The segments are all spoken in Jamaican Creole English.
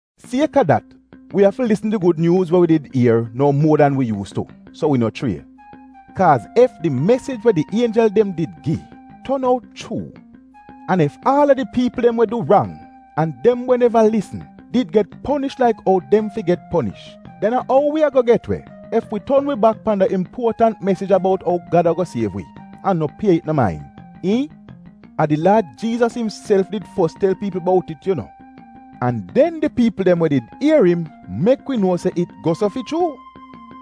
Sieka dat, wi afi lisn di Gud Nyuuz we wi did ier nou muo dan wi yuus tu, so wi no chrie. Kaaz ef di mesij we di ienjel dem did gi, ton out chuu, an ef aal a di piipl dem we du rang, an dem we neva lisn, did get ponish laik ou dem fi get ponish, den a ou wi ago get we, ef wi ton wi bak pan da impuotant mesij ya bout ou Gad ago siev wi, an no pie it no main, iihn? A di Laad Jiizas imself did fos tel piipl bout it yu nuo. An den di piipl dem we did ier im, mek wi nuo se it go so fi chuu.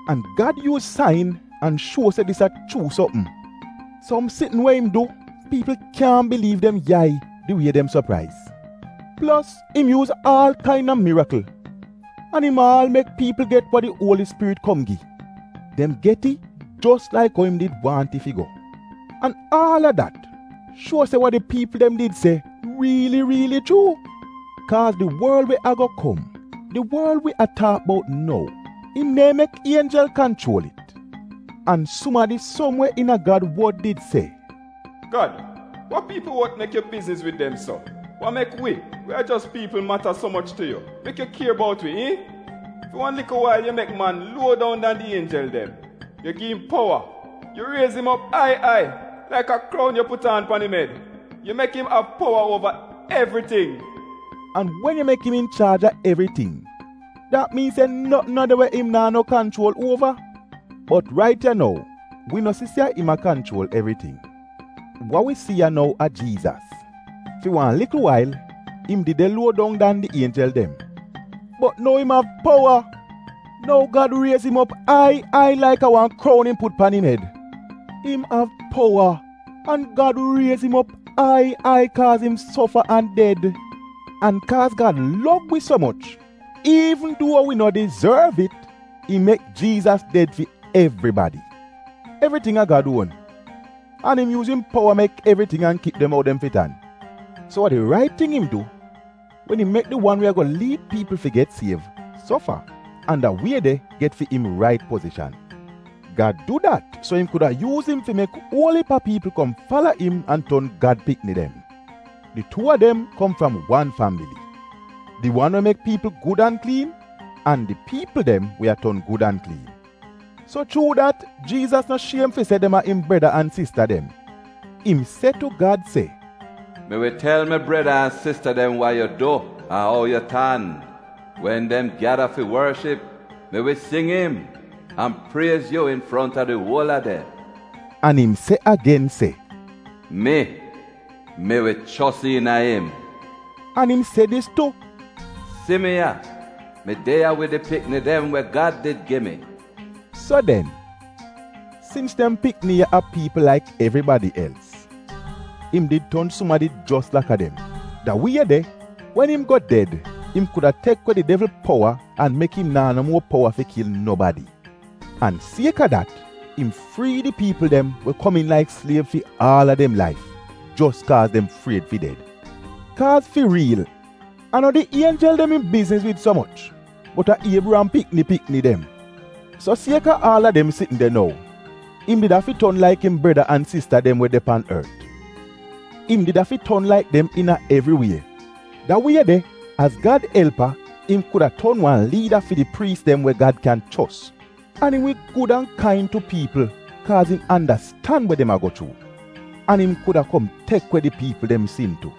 An Gad yuuz sain an shuo se dis a chuu sopm. Som sitn we im du, piipl kyaahn biliiv dem yai di wie dem sopraiz! Plos im yuuz aal kaina mirikl. An im aal mek piipl get wa di Uoli Spirit kom gi. Dem get it jos laik ou im did waahn it fi go. An aal a dat shuo se wa di piipl dem did se riili riili chuu. Kaaz di worl we ago kom — di worl wi a taak bout nou, im neehn mek ienjel kanchuol it. An sumadi, som we iina Gad wod, did se, “Gad, wa piipl wot mek yu bizniz wid dem so? Wa mek wi, we a jos piipl, mata so moch tu yu mek yu kier bout wi, iihn? Fi wan likl wail yu mek man luo dong dan di ienjel dem. Yu gi im powa. Yu riez im op ai ai, laik a kroun yu put aan pan im ed. Yu mek im av powa uova evriting.” An wen yu mek im inchaaj a evriting, dat miin se notn no de we im naa no kanchuol uova. Bot rait ya nou, wi no si se a im kanchuol evriting. Wa wi si ya nou a Jiizas. Fi wan likl wail im did de luo dong dan di ienjel dem, bot nou im av powa. Nou Gad riez im op ai ai laik a wan kroun im put pan im ed. Im av powa an Gad riez im op ai ai kaaz im sofa an ded. An kaaz Gad lov wi so moch iivn duo wi no dizorv it, im mek Jiizas ded fi evribadi. Evriting a Gad uon, an im yuuz im powa mek evriting an kip dem ou dem fi tan. So a di rait ting im du wen im mek di wan we ago liid piipl fi get siev, sofa, an da wie de get fi im rait pozishan. Gad du dat so im kuda yuuz im fi mek uol iip a piipl kom fala im an ton Gad pikni dem. Di tuu a dem kom fram wan fambili: di wan we mek piipl gud an kliin an di piipl dem we a ton gud an kliin. So chuu dat, Jiizas no shiem fi se dem a im breda an sista dem. Im se tu Gad se, “Mi wi tel mi breda an sista dem wa yu du an ou yu tan; wen dem gyada fi worship, mi wi sing im, an priez yu infronta di uol a dem.” An im se agen se, “Mi — mi wi chos iina im.” An im se dis tu, “Si mi ya, mi de ya wid di pikni dem we Gad did gi mi.” So den, sins dem pikni ya a piipl laik evribadi els, im did ton sumadi jos laka dem, da wie de, wen im go ded, im kuda tek we di devl powa, an mek im naa no muo powa fi kil nobadi. An sieka dat, im frii di piipl dem we komiin laik sliev fi aal a dem laif jos kaaz dem fried fi ded. Kaaz fi riil, a no di ienjel dem im bizniz wid so moch, bot a Iebriyam pikni pikni dem. So sieka aal a dem sitn de nou, im did afi ton laik im breda an sista dem we de pan ort. Im did afi ton laik dem iina evri wie. Da wie de, az Gad elpa, im kuda ton wan liida fi di priis dem we Gad kyan chos, an im wi gud an kain tu piipl kaaz im andastan we dem a go chuu. An im kuda kom tek we di piipl dem sin tu.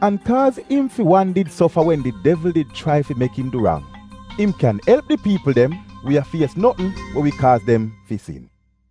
An kaaz im fi wan did sofa wen di devl did chrai fi mek im du rang, im kyan elp di piipl dem we a fies notn we wi kaaz dem fi sin.